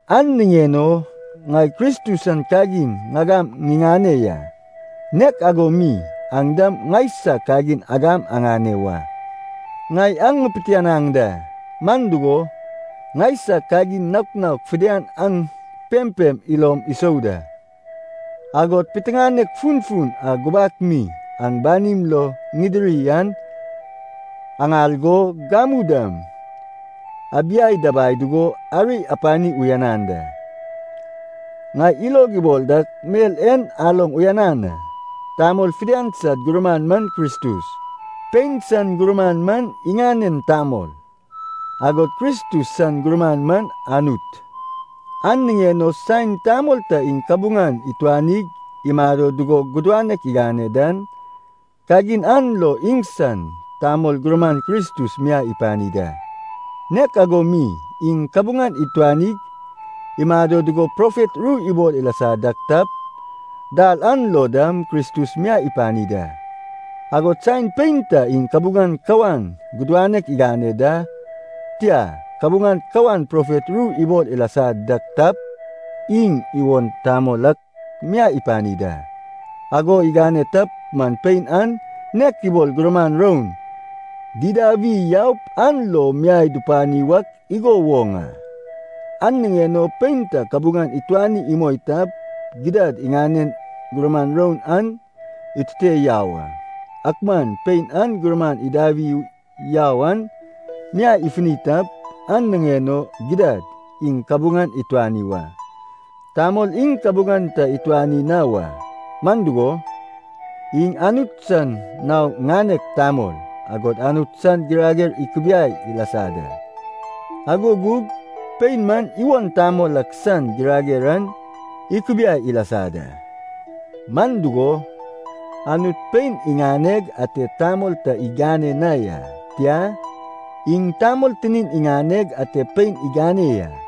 An niŋen o ŋai Kristus san kagin ŋagam ŋiŋane ya. Nek ago mi aŋ dam ŋaisag kagin agam aŋane wa. Ŋai aŋ ŋipitianaŋ da, man dugo, ŋaisag kagin naok naok fidian aŋ pempem ilom isou da, agod piteŋanek funfun a gubak mi aŋ banim lo ŋidiri an aŋal go, gamu dam abiai dabai dugo, ari apani uyanan da. Ŋai ilog ibol dak mel en aloŋ uyanan a. Tamol fidian sad gurman man Kristus, pein san gurman man iŋanen tamol, agod Kristus san gurman man Anut. An niŋen o saen tamol ta iŋ kabuŋan ituanig imado dugo gudanek igane dan, kagin an lo iŋsan tamol gurman Kristus miai ipani da. Nek ago mi iŋ kabuŋan ituanig imado dugo profet ru ibol ilasa dak tap, dal an lo dam Kristus miai ipani da. Agod saen pein ta iŋ kabuŋan kawan gudanek igane da, tia, kabuŋan kawan profet ru ibol ilasa dak tap, iŋ iwon tamol ak miai ipani da. Ago igane tap man pein an nek ibol gurman roun didawi yaup an lo miai dupani wak igo woŋ a. An niŋen o pein ta kabuŋan ituani imoi tap, gidad iŋanen gurman roun an itute yau a. Ak man pein an gurman idawi yau an miai ifuni tap, an niŋen o gidad iŋ kabuŋan ituani wa. Tamol iŋ kabuŋan ta ituani na wa. Man dugo, iŋ Anut san nao ŋanek tamol, agod Anut san girager ikubiai ilasa da. Ago gug pein man iwon tamol ak san girager an ikubiai ilasa da. Man dugo, Anut pein iŋaneg ate tamol ta igane na ya. Tia, iŋ tamol tinin iŋaneg ate pein igane ya.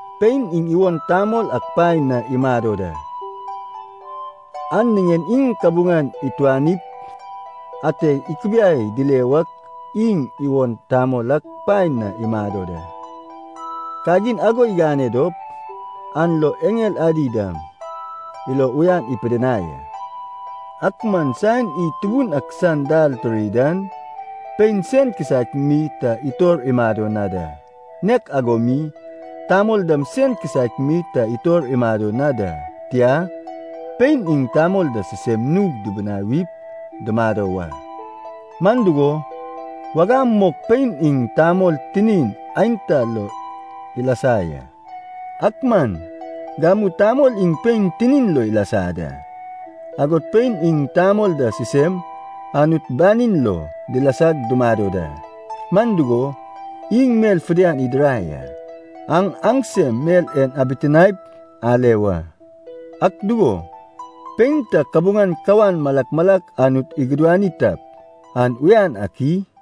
Pein iŋ iwon tamol ak paen na imado da, an niŋen iŋ kabuŋan ituanip ate ikubiai dile wak iŋ iwon tamol ak paen na imado da. Kagin ago igane dop, an lo eŋel adi dam ilo uyan ipidinai a. Ak man saen id Tubun ak san dal tiri dan, pein sen kisaek mi ta itor imado na da, nek ago mi tamol dam sen kisaek mi ta itor imado na da. Tia, pein iŋ tamol da sisem nug dubunawip dumado wa. Man dugo, wagam mok pein iŋ tamol tinin aenta lo ilasa ya. Ak man gamu tamol iŋ pein tinin lo ilasa da. Agod pein iŋ tamol da sisem Anut banin lo dilasag dumado da, man dugo, iŋ mel fidian idirai a. Aŋ aŋsem mel en abitinaep ale wa. Ak dugo, pein ta kabuŋan kawan malak malak Anut igudani tap, an uyan ak i?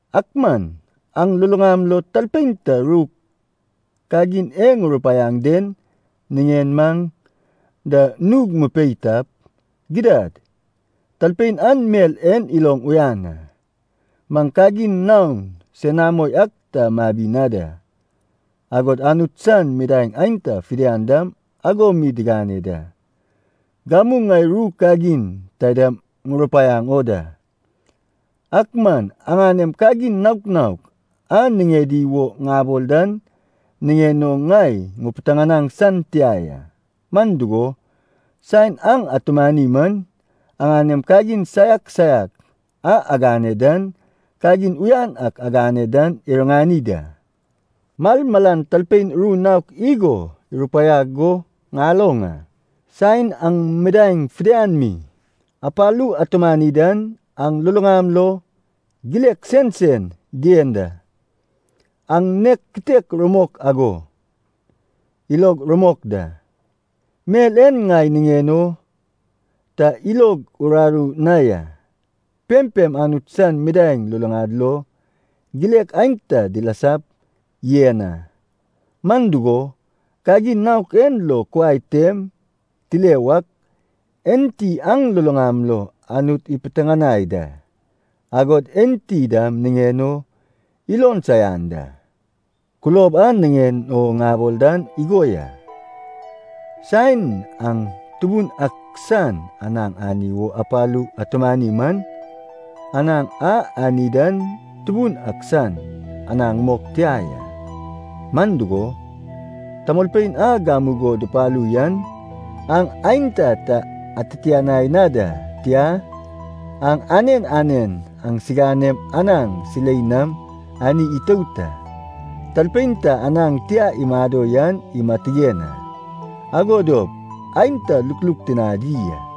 Ak man aŋ luluŋam lo talpein ta ru kagin e ŋurupaiaŋ den niŋen maŋ da nug mupei tap, gidad talpein an mel en iloŋ uyan a, maŋ kagin naon senamo ak ta mabi na da. Agod Anut san midaeŋ aenta fidian dam ago mi digane da. Gamu ŋai ru kagin taidam ŋurupaiaŋ o da. Ak man aŋanem kagin naok naok a niŋedi wo ŋabol dan niŋen o ŋai ŋupitianaŋ san tia ya. Man dugo, saen aŋ atumani man aŋanem kagin saiak saiak a agane dan, kagin uyan ak agane dan iriŋani da. Malmalan talpein ru naok igo irupaiag go ŋaloŋ a. Saen aŋ midaeŋ fidian mi apalu atumani dan, aŋ luluŋam lo gilek sensen dien da. An nag kitek rumok ago ilog rumok da. Mel en ŋai niŋen o ta ilog uraru na ya, pempem Anut san midaeŋ luluŋad lo gilek aenta dilasap yen a. Man dugo, kagin naok en lo kuai tem tile wak, enti aŋ luluŋam lo Anut ipitianai da, agod enti dam niŋen o ilon saian da. Kulob a niŋen o ŋabol dan igo ya. Saen aŋ Tubun ak san anaŋ ani wo apalug atumani man, anaŋ a ani dan Tubun ak san anaŋ mok tia ya. Man dugo, tamolpein a gamugo dupalu yan aŋ aenta ta atitianai na da, tia, aŋ anen anen aŋsiganem anaŋ silei nam anig itout a. Talpein ta anaŋ tia imado yan imatigen a, ago dop aenta lukluk tinadi a.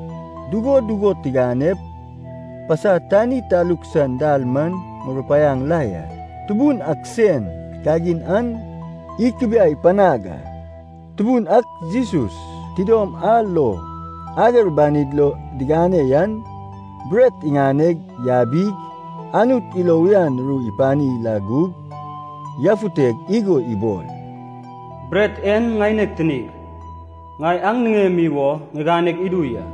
Dugo dugo tiganep, pasa tani taluk san dal man ŋurupaiaŋ la ya, Tubun ak sen kagin an ikubiai panag a. Tubun ak Jesus, tidom a lo ager banid lo digane yan, bret iŋane yabig, Anut ilo uyan ru ipani la gug, yafuteg igo ibol, “Bret en ŋaineg tinig, ŋai aŋ niŋemi wo ŋiganeg idu ya.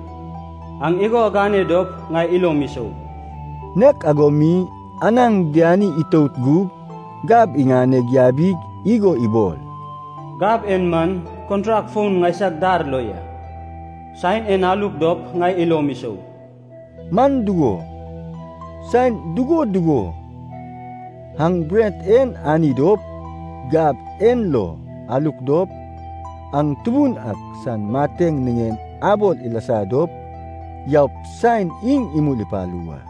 Aŋ igo agane dop ŋai ilom isou.” Nek ago mi, anaŋ diani itout gug gab iŋane yabig igo ibol, “Gab en man kontrak foun ŋaisag dar lo ya. Saen en aluk dop ŋai ilom isou.” Man dugo, saen dugo dugo aŋ bret en ani dop, gab en lo aluk dop, aŋ Tubun ak san mateŋ niŋen abol ilasa dop yaup saen iŋ imul ipalu wa.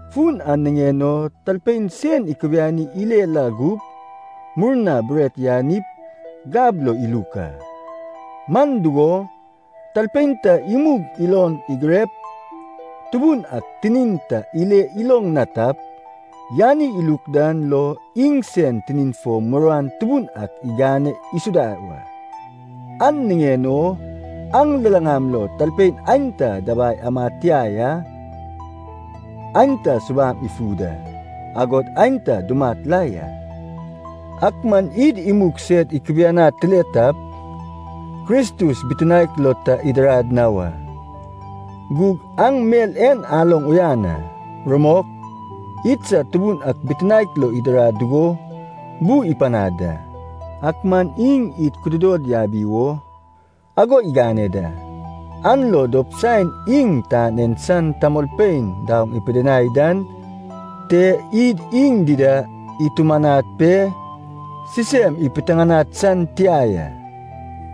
Fun an niŋen o talpein sen ikubiani ile la gup, murna bret yanip gab lo iluk a. Man dugo, talpein ta imug ilon igirep Tubun ak tinin ta ile iloŋ na tap, yani iluk dan lo iŋsen tinin fo muruan tubun ak igane isuda wa. An niŋen o aŋ luluŋam lo tamolpein aenta dabai amad tia ya, aenta subam ifu da, agod aenta dumat la ya. Ak man id imug sed ikubianad tile tap, Kristus bitinaek lo ta idirad na wa. Gug aŋ mel en aloŋ uyan a. Rumok, idsad Tubun ak bitinaek lo idirad dugo bu ipanad da. Ak man iŋ id kududod yabi wo ago igane da, an lo dop saen iŋ tan en san tamolpein daoŋ ipidinai dan te id iŋ dida itumanad pe sisem ipitiŋinad san tia ya.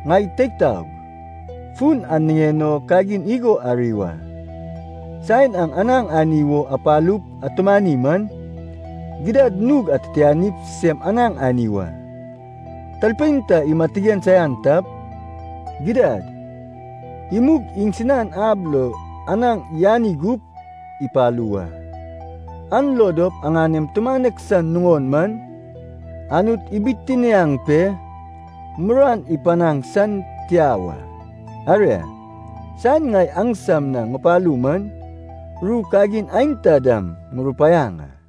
Ŋai teig taog, fun an niŋen o kagin igo ari wa. Saen aŋ anaŋ ani wo apalup atumani man, gidad nug atitianip sisem anaŋ ani wa. Talpein ta imatigen saian tap, gidad imug iŋsinan ab lo anaŋ yani gup ipalu wa. An lo dop aŋanem tumanek san nuŋon man, Anut ibitiniaŋ pe muruan ipanaŋ san tia wa. Aria, saen ŋai aŋsam na ŋupalu man ru kagin aenta dam ŋurupaiaŋ a.